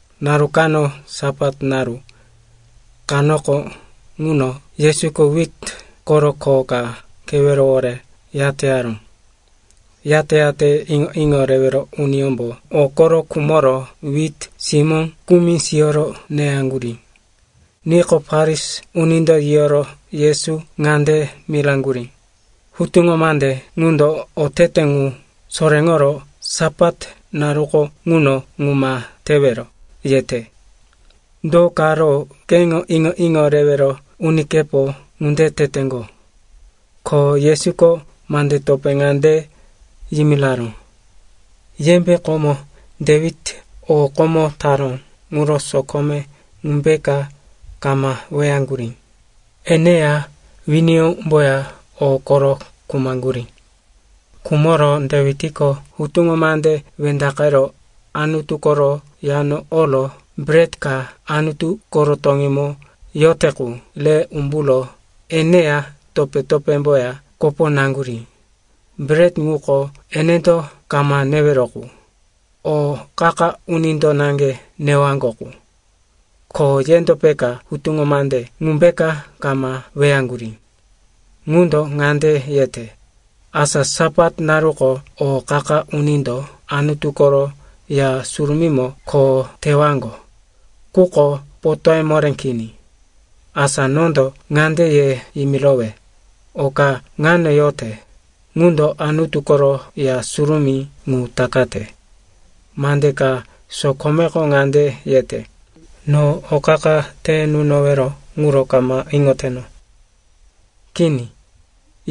Naru kano, Sapat naru kanoko ŋuno, Yesuko wit koro kho ka kewerowore yateyaró. Yate-yate iŋo-iŋo rewero uniyómbo o koro khumoro wit simó kumi siyoro neyaŋgurí. Niqo, Farisi unindo yiyoro Yesu ŋande miraŋgurí, “Hutuŋo mande ŋundo otete ŋu soréŋoro, Sapat naruko ŋuno ŋu ma tewero, yete. Do karo keŋo iŋo-iŋo rewero unikepo ŋunde teteŋgo?” Ko Yesuko mande topé ŋande yimiraró, “Yembe komo Dewit o komo taró ŋuro sokome ŋumbeka kama weyaŋgurí? Eneya winiyómboya o koro khumaŋgurí. Khumoro Dewitko hutuŋo mande wendaqero Anutu koro yano oro bret ka Anutu koro toŋímo yote qu re umburo eneya topé-topémboya kopo naŋgurí. Bret ŋuko enendo kama rewero qu, o qa-qa unindo naŋge newaŋgo qu. Ko yendo peka Hutuŋo Mande ŋumbeka kama weyaŋgurí, ŋundo ŋande yete, asa Sapat naruko o qa-qa unindo Anutu koro Ya Surumímo kho tewaŋgo, quko potóye moré kini. Asa nondo ŋande ye yimirowe, oka ŋano yote, ŋundo Anutu koro Ya Surumí ŋu takate. Mande ka sokomeko ŋande yete, ‘No o qa-qa te nunowero ŋuro kama iŋoteno. Kini,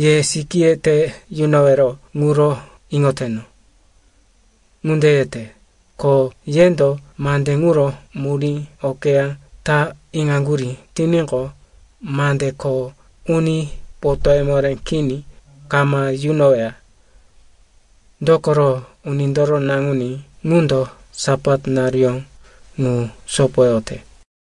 ye sikíye te yunowero ŋuro iŋoteno.’ Ŋunde yete, ko yendo mande ŋuro murí okeyá ta iŋaŋgurí tiníqo, mande kho uni potóye moré kini kama yunoweya. Dokoro Unindoro Naŋuní ŋundo Sapat naruyó ŋu sopoyote.”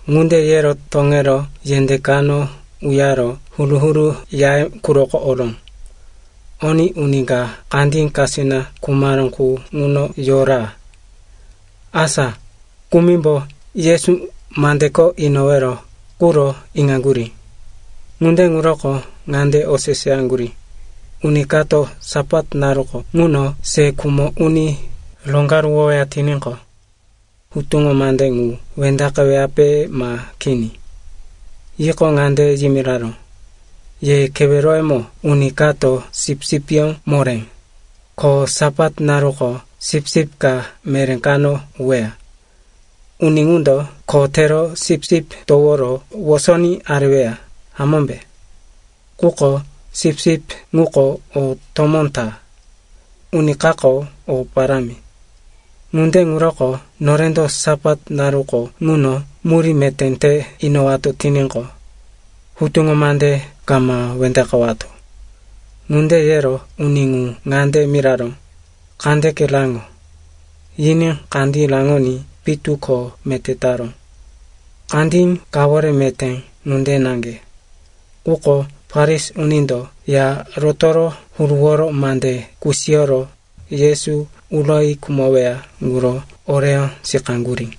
Ŋunde yero toŋero yendé kano uyaro huru-huru yaye quroko oró. Oní uni ka kandí kasina khumaró qu ŋuno yora. Asa kumimbo Yesu mande kho inowero quro iŋaŋgurí, ŋunde ŋuroko ŋande oseseyaŋgurí, “Uni kato Sapat naruko ŋuno se khumo uni roŋgaruwoweya tiníqo, hutuŋo mande ŋu wendaqeweyape ma kini?” Yiqo, ŋande yimiraró, “Ye keweroyemo uni kato sipsipyó moré, ko Sapat naruko sipsip ka meré kano uweya. Uni ŋundo kho tero sipsip toworo wosoní areweya, hamómbe? Quko sipsip ŋuko o tomó ta, uni kako o parámi. Ŋunde ŋuroko norendo Sapat naruko ŋuno murí meté te inowato tiníqo, hutuŋo mande kama wendaqewato.” Ŋunde yero uni ŋu ŋande miraró, “Kandeke raŋo.” Yiní kandí raŋoní pitu ko meté taró, kandí kawore meté ŋunde naŋge. Quko Farisi unindo ya rotoro huruworo mande kusiyoro Yesu uroyi khumoweya ŋuro oreyó seqaŋgurí.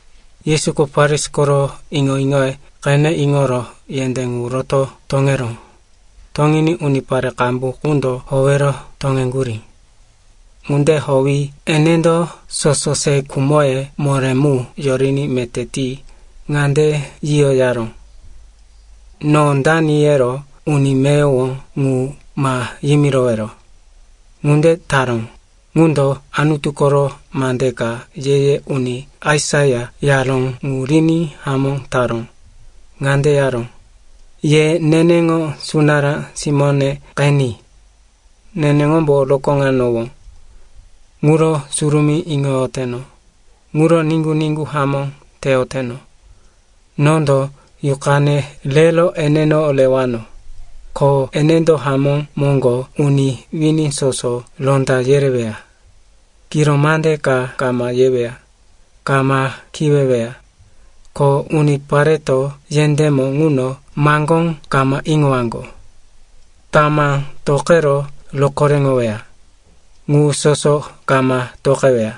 Yesuko Farisi koro iŋo-iŋoye qene iŋoro yendé ŋu roto toŋeró. Toŋiní unipare qambu qundo howero toŋeŋgurí. Ŋunde howi enendo soso se khumoye moré mu yoriní meté ti ŋande yiyo yaró, “No dani yero uni meyowo ŋu ma yimirowero.” Ŋunde taró ŋundo Anutu koro mande ka ye-ye uni Aisaia yaró ŋu riní hamó taró. Ŋande yaró, “Ye neneŋo sunará simóne qeni. Neneŋombo rokóŋanowó. Ŋuro surumí iŋoyoteno, ŋuro niŋgu-niŋgu hamó teyoteno. Nondo Yuqane rero eneno rewano, ko enendo hamó moŋgo uni wini soso ronda yereweya. Kiro mande ka kama yeweya, kama kiweweya, ko unipareto yendémo ŋuno maŋgó kama iŋowaŋgo. Tamá toqero rokoreŋoweya, ŋu soso kama toqeweya,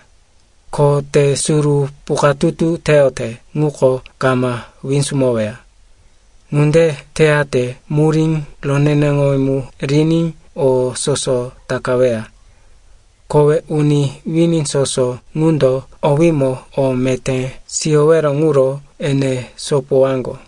ko te suru pukatutu teyote ŋuko kama winzumoweya. Ŋunde teyate murí roneneŋowí mu riní o soso takaweya. Kowe uni wini soso ŋundo owímo o meté siyowero ŋuro ene sopowaŋgo.”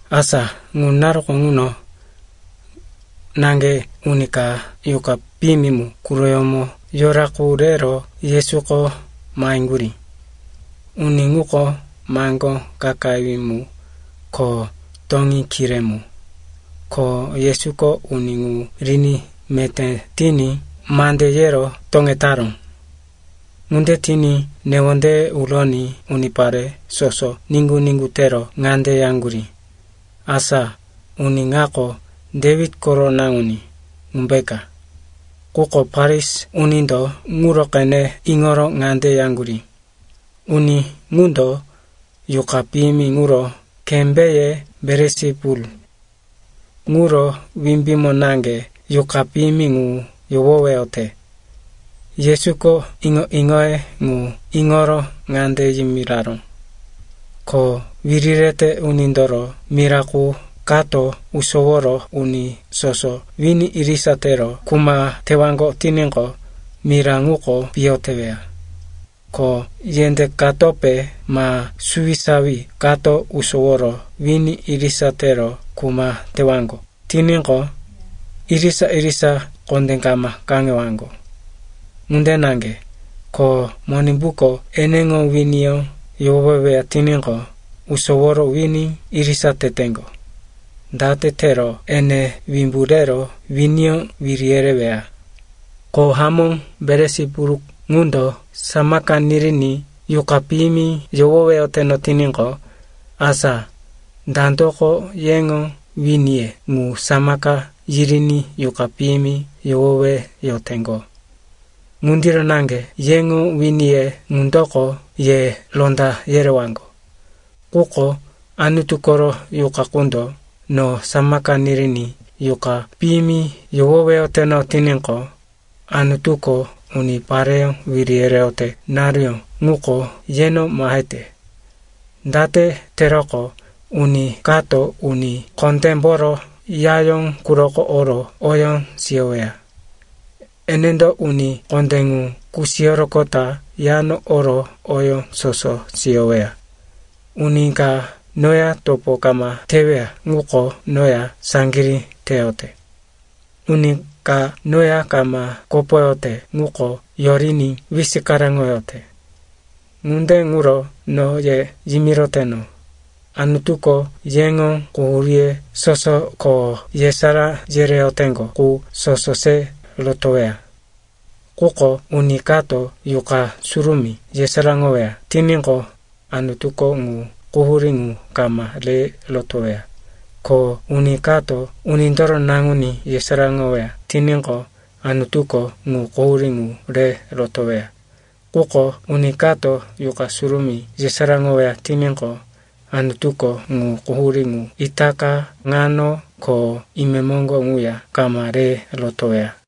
Asa ŋu naruko ŋuno naŋge uni ka yuqa piyimi mu quroyómo yora qu rero Yesuko maheŋgurí. Uni ŋuko maŋgó kakayiwí mu ko toŋí kiré mu. Ko Yesuko uni ŋu riní meté tiní mande yero toŋetaró. Ŋunde tiní newondeye uroní unipare soso niŋgu-niŋgu tero ŋande yaŋgurí, “Asa, uni ŋako Dewit koro naŋuní ŋumbeka?” Quko Farisi unindo ŋuro qene iŋoro ŋande yaŋgurí, “Uni ŋundo yuqa piyimi ŋuro kembéye, Belisipulu, ŋuro wimbímo naŋge yuqa piyimi ŋu yohoweyote.” Yesuko iŋo-iŋoye ŋu iŋoro ŋande yimiraró, “Ko wiri yerete unindoro mira qu kato usoworo uni soso wini irisa tero kuma tewaŋgo tiníqo, mira ŋuko piyo teweya. Ko yendé katope ma suwisawi kato usoworo wini irisa tero kuma tewaŋgo tiníqo, irisa-irisa kondé kama kaŋewaŋgo. Ŋunde naŋge, ko Monimbuko eneŋo winiyó yohoweweya tiníqo, usoworo wini irisa teteŋgo. Date tero ene wimbu rero winiyó wiri yereweya? Ko hamó Belisipulu ŋundo samaka niriní yuqa piyimi yohoweyoteno tiníqo, asa dandoko yeŋo winiye ŋu samaka yiriní yuqa piyimi yohoweyoteŋgo? Ŋundiro naŋge yeŋo winiye ŋundoko ye ronda yerewaŋgo. Quko Anutu koro Yuqa qundo no samaka niriní yuqa piyimi yohoweyoteno tiníqo, Anutuko unipareyó wiri yereyote naruyó ŋuko yeno mahete. “Date teroqo, uni kato uni kondémboro yayó quroko oro oyó siyoweya? Enendo uni kondé ŋu kusiyoroqota yano oro oyó soso siyoweya. “Uni ka noya topo kama teweya ŋuko noya saŋgirí teyote. Uni ka noya kama kopoyote ŋuko yoriní wisikaraŋoyote. Ŋunde ŋuro no ye yimiroteno, Anutuko yeŋo quhuríye soso ko yesará yereyoteŋgo qu soso se rotoweya. Quko uni kato Yuqa Surumí yesaráŋoweya tiníqo, Anutuko ŋu quhurí ŋu kama re rotoweya. Ko uni kato Unindoro Naŋuní yesaráŋoweya tiníqo, Anutuko ŋu quhurí ŋu re rotoweya. Quko uni kato Yuqa Surumí yesaráŋoweya tiníqo, Anutuko ŋu quhurí ŋu itaka ŋano ko imemoŋgo ŋuya kama re rotoweya.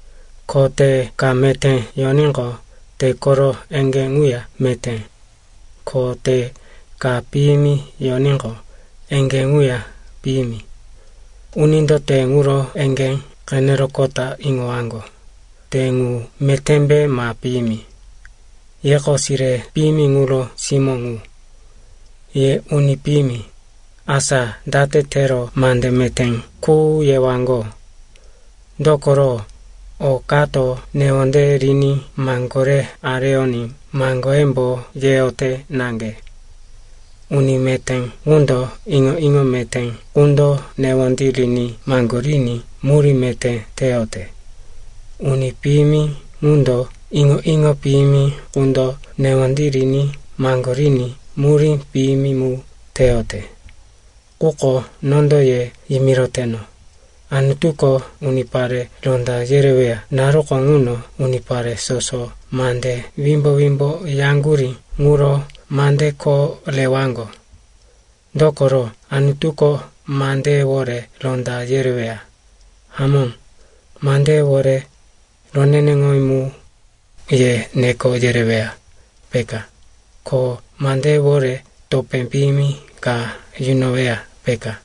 “Ko te ka meté yoníqo, te koro eŋgé ŋuya meté. Ko te ka piyimi yoníqo, eŋgé ŋuya piyimi. Unindo te ŋuro eŋgé qeneroqota iŋowaŋgo, te ŋu metémbe ma piyimi. Yeko sire piyimi ŋuro simó ŋu. Ye uni piyimi, asa date tero mande meté qu yewaŋgo? Dokoro okato newondeye riní maŋgore areyoní maŋgoyembo yeyote naŋge. Uni meté ŋundo iŋo-iŋo meté qundo newondí riní maŋgoriní murí meté teyote. Uni piyimi ŋundo iŋo-iŋo piyimi qundo newondí riní maŋgoriní murí piyimi mu teyote. Quko nondo ye yimiroteno, Anutuko unipare ronda yereweya naruko ŋuno unipare soso mande wimbo-wimbo yaŋgurí ŋuro mande kho rewaŋgo. Dokoro Anutuko mandeyewore ronda yereweya. Hamó, mandeyewore, roneneŋowí mu, ye neko yereweya, peka, ko mandeyewore topé piyimi ka yunoweya, peka.”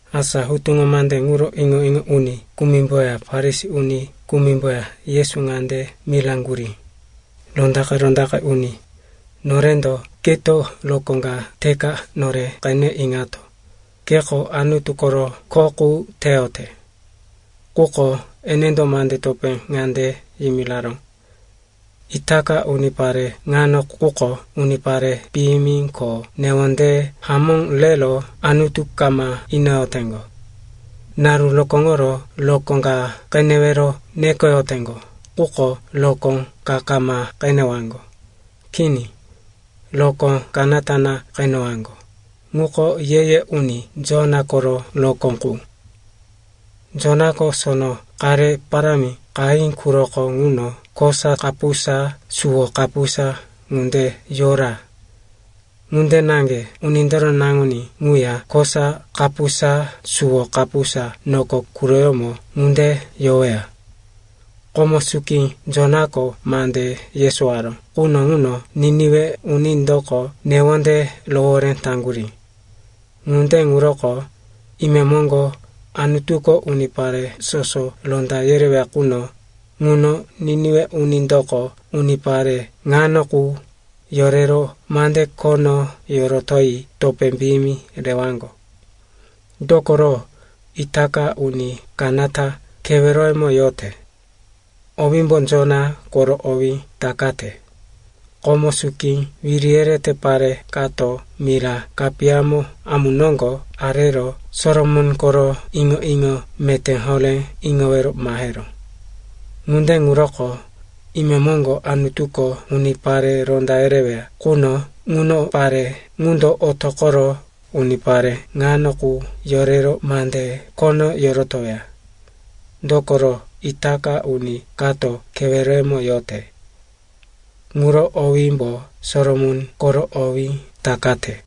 Asa hutuŋo mande ŋuro iŋo-iŋo uni kumimboya Farisi uni kumimboya Yesu ŋande miraŋgurí, “Rondaqe-rondaqe Uni, norendo keto rokó ka teka nore qene iŋato, keko Anutu koro kho qu teyote.” Quko enendo mande topé ŋande yimiraró, “Itaka unipare ŋano quko unipare piyimi ko newondeye hamó rero Anutu kama inoyoteŋgo. Naru rokóŋoro rokó ka qenewero nekoyoteŋgo. Quko rokó ka kama qenewaŋgo. Kini. Rokó kanata na qenewaŋgo, ŋuko ye-ye uni Jona koro rokó qu. Jonako sono qare parámi qahí quroko ŋuno kosa kapusa suwo kapusa ŋunde yora. Ŋunde naŋge Unindoro Naŋuní ŋuya kosa kapusa suwo kapusa noko quroyómo ŋunde yoweya. Komo suki Jonako mande yesowaró quno ŋuno Niniwe unindoko newonde rohoré taŋgurí. Ŋunde ŋuroko imemoŋgo, Anutuko unipare soso ronda yereweya quno ŋuno Niniwe unindoko unipare ŋano qu yorero mande khono yorotoyi topé piyimi rewaŋgo. Dokoro itaka uni kanata keweroyemo yote, owímbo Jona koro owí takate. Komo suki wiri yerete pare kato mira kapiyamo amu noŋgo arero Solomon koro iŋo-iŋo meté horé iŋowero maheró. Ŋunde ŋuroko imemoŋgo, Anutuko unipare ronda yereweya quno ŋuno pare ŋundo otoqoro unipare ŋano qu yorero mande khono yorotoweya. Dokoro itaka uni kato keweroyemo yote, ŋuro owímbo Solomon koro owí takate.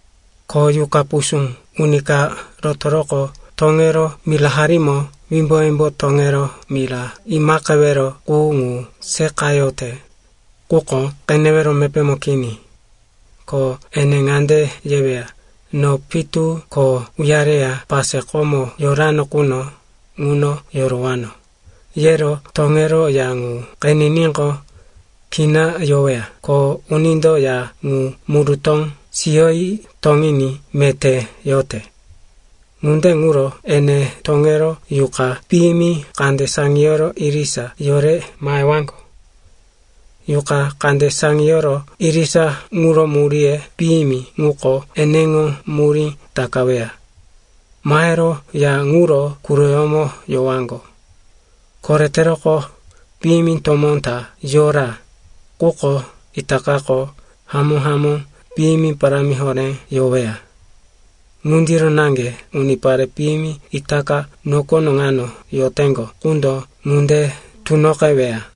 “Ko yuqa pusú uni ka rotoroqo toŋero mira harimo wimbo-wimbo toŋero mira imaqewero qu ŋu seqayote, quko qenewero mepémo kini. Ko ene ŋande yeweya, ‘No pitu ko uyareya pase komo yorano quno ŋuno yorowano.’ Yero toŋero ya ŋu qeniníqo, kina yoweya, ko unindo ya ŋu murutó siyoyi toŋiní meté yote. Ŋunde ŋuro ene toŋero yuqa piyimi kande saŋiyoro irisa yore mahewaŋgo. Yuqa kande saŋiyoro irisa ŋuro muríye piyimi ŋuko eneŋo murí takaweya. Mahero ya ŋuro quroyómo yowaŋgo. Koreteroqo, piyimi tomó ta yora, quko itakako hamó-hamó piyimi parámi horé yoweya. Ŋundiro naŋge unipare piyimi itaka nokono ŋano yoteŋgo qundo ŋunde tunoqeweya.”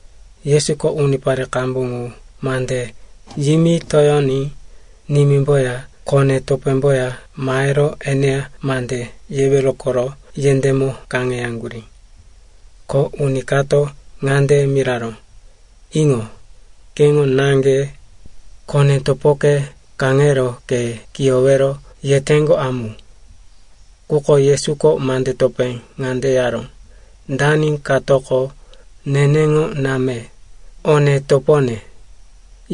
Yesuko unipare qambu ŋu mande yimitoyoní, nimímboya kone-topémboya mahero eneya mande yewero koro yendémo kaŋeyaŋgurí. Ko uni kato ŋande miraró, “Iŋo, keŋo náŋge, kone-topoke kaŋero ke kiyowero yeteŋgo amu.” Quko Yesuko mande topé ŋande yaró, “Dani katoko neneŋo náme, one-topone?”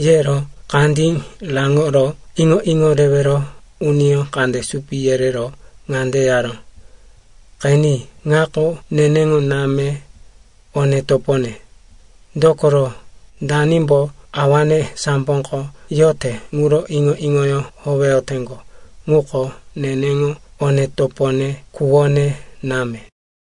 Yero kandí raŋoro iŋo-iŋo rewero uniyó kande supi yerero ŋande yaró, “Qeni, ŋako neneŋo náme, one-topone. Dokoro danimbo awane samboko yote ŋuro iŋo-iŋoyó howeyoteŋgo, ŋuko neneŋo one-topone, kuwone, náme.”